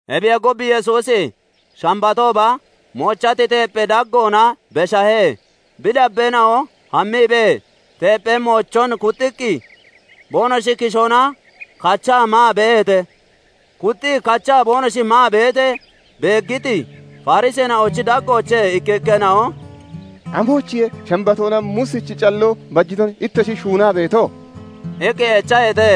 Ebiyee gub, Yesuusi Shambatooba moochati teepphee daggoona beshahe; bi dabbeena'o hammiibee teepphee moochoon kuxxiqqi boonoshi kishoona kachaa maa beeheete. Kuxxii kachaa boonoshi maa beetee beeggiti Fariseena'ochi daggoochee ikkikkeena'o "Amoyichiye Shambatoona Muusichi calloo bajiton ittoshi shuunaa beeto?" iqqi echaheete.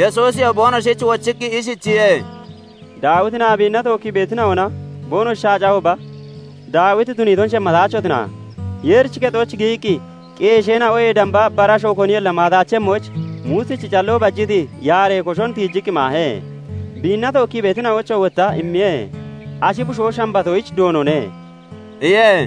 Yesuusiyoo boonoshich wochiqqi ishichiye:- "Daawitinaa biinna tookkii beetina'ona boonoshi shaacahooba, Daawiti tuniiton shemmataachotina? Yeerichi kexooch giyiqqi qeesheena'oyee damba bara asho koniyolla maataachemmoyich, Muusichi calloo bajiti yaaree koshon tiijiqqi maahe; biinna tookkii beetina'oyichoo wotta immiye. Ashi bushoo Shambatoyich Doonone" iye.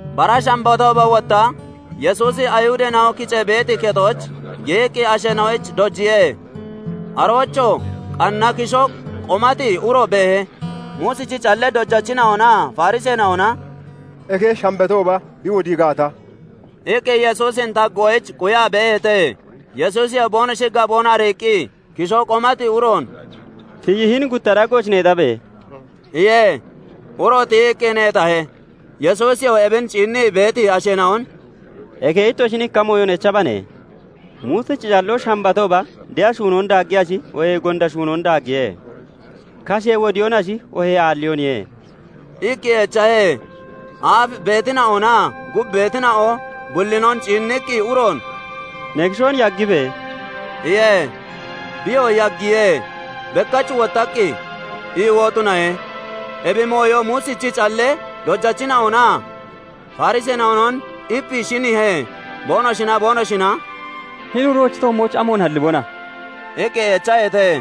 Bara Shambatooba wotta Yesuusi Ayihudeena'o kicee beeti kexooch giyiqqi asheena'oyich dojiye. Aroochoo qanna kishoo qomati uro beehe. Muusichi callee dojachina'onaa Fariseena'ona "Eke Shambatooba bi wodii gaata..." iqqi Yesuusin taggoyich quyaa beeheete. Yesuusiyoo boonoshi gaboon ariiqqi kishoo qomati uroon "Tiyi hini gutta daggooch neexabe!" iye. Uroo tiyiqqi neexahe. Yesuusiyoo ebin ciinnii beeti asheena'on "Eke ittoshin ikka mooyon echabane. Muusichi calloo Shambatooba de'a shuunoon daaggiyashi, oohee gonda shuunoon daaggiye? Kashee wodiyoonashi, oohee aalliyooniye?" iqqi echahe. Aaf beetina'onaa gub beetina'o bullinon ciinniqqi, uroon "Ne kishoon yaggibe!" iye. Biyoo yaggiye; bekkach wottaqqi iiwoo tunahe. Ebi mooyo Muusichi callee dojachina'onaa Fariseena'onon ipii shiniihe; boonoshinaa boonoshina "Hini uroochi toommooch amoon hallibona?" iqqi echeeheete.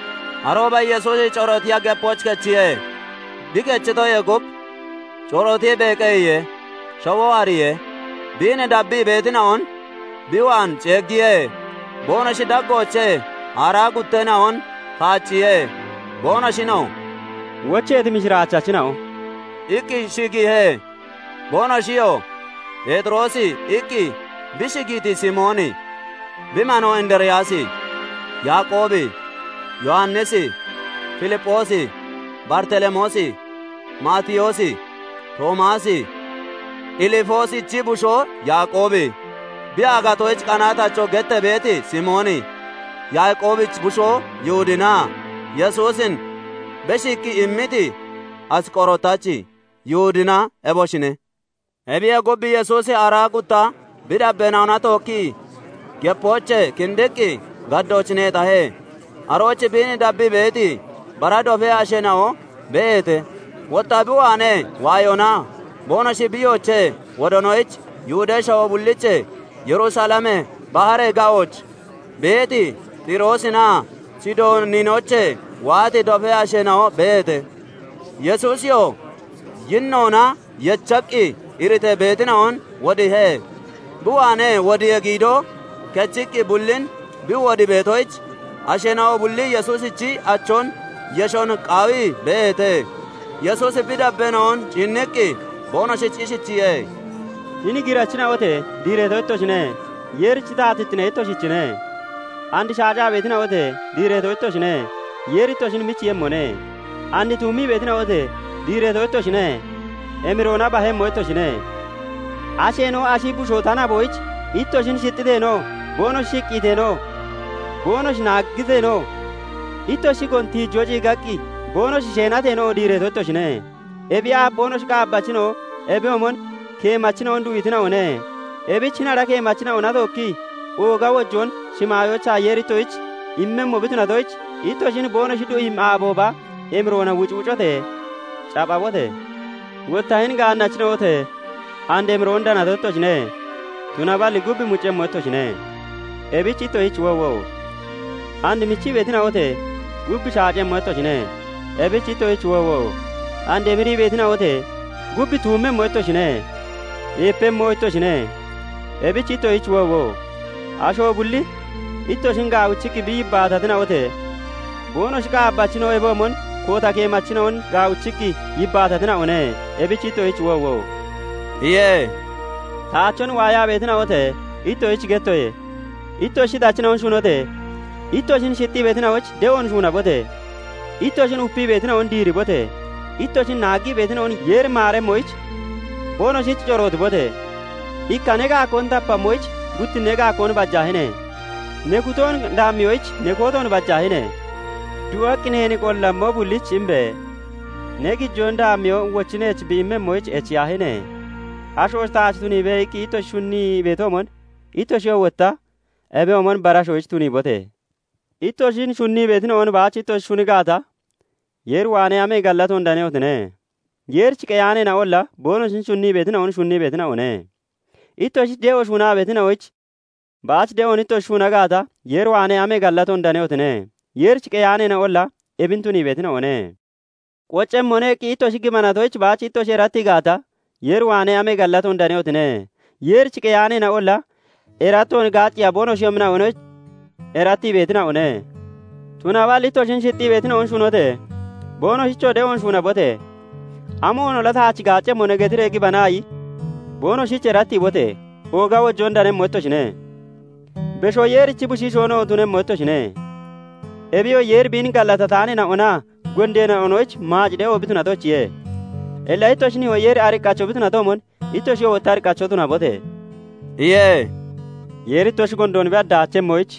Arooba Yesuusi corootiya gepooch kechiye. Bi kechitoyee gub corootiibee qeyiye. shawoo hariyee, biin dabbii beetina'on bi waan ceeggiye; boonoshi daggoochee aaraa gutteena'on kaacciye; boonoshinoo "Wocheeti mishiraachachina'o" iqqi shigiihe. Boonoshiyoo "Pheexiroosi" iqqi bi shigiiti Simooni, bi manoo Indiriyaasi, Yaaqoobi, Yowannisi, Filipphoosi, Baritelemoosi, Maatiyoosi, Toomaasi, Ilifoosichi bushoo Yaaqoobi, bi aagatoyich qanaatacho gettee beeti Simooni, Yaaqoobichi bushoo Yihudinaa Yesuusin beshiiqqi immiti Asqorotachi Yihudina eboshine. Ebiyee gub, Yesuusi aaraa gutta bi dabbeena'ona tookkii gepoochee kindiqqi gaddooch neexahe; arooch biin dabbii beeti bara dofee asheena'o beeheete; wotta bi waanee waayoonaa boonoshi biiyoochee wodoonoyich Yihudee shawoo bulliichee, Yerusalemee, baharee ga'ooch beeti Xiroosinaa Sidooninoochee waati dofee asheena'o beeheete. Yesuusiyoo yinnoona yechaqqi iritee beetina'on wodiihe; bi waanee wodiyee giidoo kechiqqi bullin bi wodii beetoyich, asheena'o bulli Yesuusichi achoon yeshon qaawii beeheete. Yesuusi bi dabbeena'on ciinniqqi boonoshich ishichiye:- "Hini girachina'ote! Diireeto ittoshine; Yeerichi taatittine itosichine. And shaacaa beetina'ote! Diireeto ittoshine; Yeeri ittoshin michiiyemmone. And tuummii beetina'ote! Diireeto ittoshine; emiroona bahemmo ittoshine. Asheena'o ashi bushoo ta naboyich ittoshin shixxiteenoo, boonoshi shiqqiiteenoo, boonoshi naagateenoo, ittoshi shigoon tiijoo ciigaqqi boonoshi sheenateenoo, diireeto ittoshine. "Ebiyee aaf boonoshi qaabbachina'o ebiyoomon keemachina'on du'iitina'one; ebich hini ara keemachina'ona tookki ooga wojoon shimaayoochaa Yeeri ittoshich immemmo bi tunatoyich, ittoshin boonoshi du'iimmi aabooba emiroona wucwucote! capphabote! "Wotta hini gaannachina'ote! and emiroon danato ittoshine; tunaballi gub muccemmo ittoshine. Ebich ittoshich woowo! and michii beetina'ote! gub shacemmo ittoshine. ebich ittoshich woowo! and emirii beetina'ote! gub tuummemmo ittoshine; eepemmoo ittoshine. ebich ittoshich woowo! asho bulli ittoshin gaawichiqqi bi yibbaatatina'ote! boonoshi qaabbachina'o ebiyoomon koota keemachina'on gaawichiqqi yibbaatatina'one. ebich ittoshich woowo!" iye. "Taachon waayaa beetina'ote! Ittoshich gettoye; ittoshi shixachina'on shunote! Ittoshin shixxii beetina'oyich de'oon shuunabote! Ittoshin upii beetina'on diiribote! Ittoshin naaggii beetina'on Yeeri maaremmoyich, boonoshich corootibote! Ikka ne gaakkoon tapammoyich guttinnee gaakkoon bajaahine! Ne kutoon daammiyoyich ne kootoon bajaahine! Du'aqqi neen qollammo bullich imbe! Ne gijoon daammiyoo wochi neech bi immemmoyich echiyaahine! 'Asho taach tuniibe' iqqi ittoshi shunnii beetoomon, ittoshiyoo wotta ebiyoomon bara ashoyich tuniibote! "Ittoshin shunnii beetina'on baach ittoshi shuni gaata, Yeer waanee amee gallatoon danehotine? Yeerich qeyaaneena'olla boonoshin shunnii beetina'on shunnii beetina'one. Ittoshich de'oon shuunaa beetina'oyich baach de'oon ittoshi shuuna gaata, Yeer waanee amee gallatoon danehotine? Yeerich qeyaaneena'olla ebin tunii beetina'one. 'Qoccemmone' iqqi ittoshi gibanatoyich baach ittoshi erattii gaata, Yeer waanee amee gallatoon danehotine? Yeerich qeyaaneena'olla erattoon gaacceeya boonoshiyoomina'oyich erattii beetina'one. Tunaballi ittoshin shixxii beetina'on shunote! Boonoshich de'oon shuunabote! 'Amoonolla taach gaaccemmone' getiree gibanaayi, boonoshich erattiibote! Ooga wojoon danemmo ittoshine; Beshoo Yeerichi Bushiishoonoo tunemmo ittoshine; ebiyoo Yeeri biin gallatataaneena'onaa gondeena'onoyich maac de'o bi tunatoyichiye. Illa ittoshi nihoo Yeeri ariqqacho bi tunatoomon ittoshiyoo wotta ariqqacho tunabote!" iye. "Yeeri ittoshi gondoon bi hadaachemmoyich,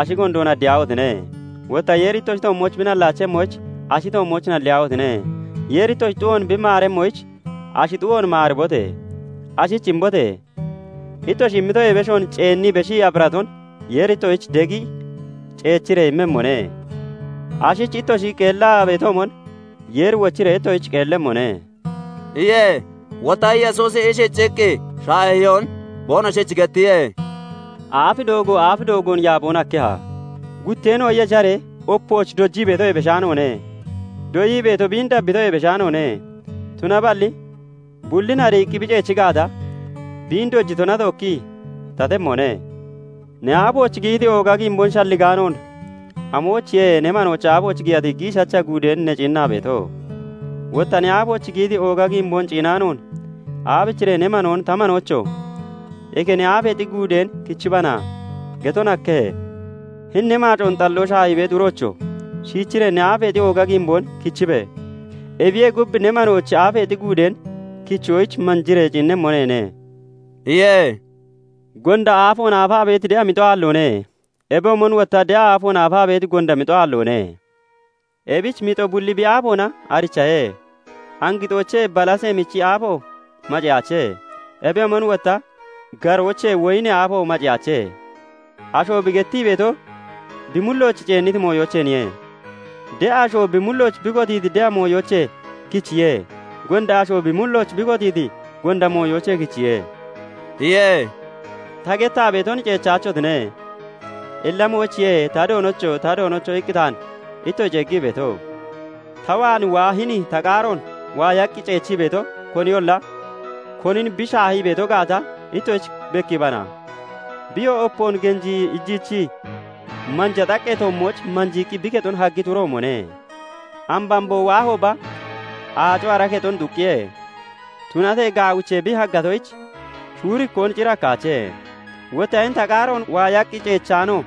ashi gondoon hadiyaahotine! Wotta Yeeri ittoshi toommooch bi nallaachemmoyich, ashi toommooch nalliyaahotine! Yeeri ittoshi xu'oon bi maaremmoyich, ashi xu'oon maaribote! Ashich imbote! Ittoshi immitoyee beshoon ceennii beshiqqi aphiraton Yeeri ittoshich degi ciichiree immemmone. Ashich ittoshi qeellaa (shafarii) beetoomon Yeeri wochiree ittoshich qeellemmone (shafaremmone)" iye. Wotta Yesuusi ishichiqqi shaahiyoon boonoshich gettiye:- "Aaf doogo aaf doogoon yaaboon hakkeha? Gutteena'o yesharee opooch dojii beetoyee beshaanoone; Doyii beeto biin dabbiitoyee beshaanoone; tunaballi bullin ariiqqi bi ciichi gaata, biin dojitona tookki tatemmone. "Ne aafooch giyiti ooga giimboon shalligaanoon, amoyichiye ne manoochi aafooch giyati giishacha guudeen ne ciinnaa beeto? Wotta ne aafooch giyiti ooga giimboon ciinaanoon, aabichiree ne manoon 'Ta manoocho! Eke ne aafeexi guudeen kichibana' geton hakkenne? Hini ne maacoon xalloo shaahii beeti uroocho! Shiichiree ne aafeexi ooga giimboon kichibe! Ebiyee gub ne manoochi aafeexi guudeen kichoyich manjiiree ciinnemmo neene" iye. "Gonda aafoon aafaa beeti de'a mixo aalloone; ebiyoomon wotta de'a aafoon aafaa beeti gonda mixo aalloone. Ebich mixo bulli bi aafoona arichahe. Angixoochee balasee michi aafo maceyaache; ebiyoomon wotta garoochee woyinee aafo maceyaache. Asho bi gettii beeto bi mullooch ceenniti mooyoocheeniye. de'a asho bi mullooch bi kotiiti de'a mooyoochee kichiye; gonda ashoo bi mullooch bi kotiiti gonda mooyoochee kichiye" iye. "Ta gettaa beeton ceechachotine. Illa amoyichiye 'Ta Doonocho! Ta Doonocho!' iqqi taan ittoshi ceeggii beeto? ta waan waa hini ta qaaroon waayaqqi ceechii beeto koniyolla, konin bi shaahii beeto gaata ittoshich bekkiibana. Biyoo opoon genjii iijichii manja xaqqee toommooch manjiiqqi bi kexon haggiti uroomone. Ambamboo waahooba, aaco ara kexon xuqqiye; tunatee gaawichee bi haggatoyich, shuurikkoon cir hakkaache. Wotta hini ta qaaroon waayaqqi ceechaano,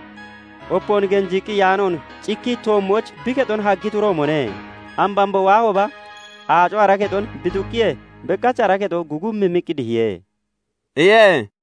opoon genjiiqqi iyaanoon, cikkii toommooch bi kexon haggiti uroomone. Ambamboo waahooba, aaco ara kexon bi xuqqiyee, bekkach ara kexo gugummimmiqqi dihiye" iye.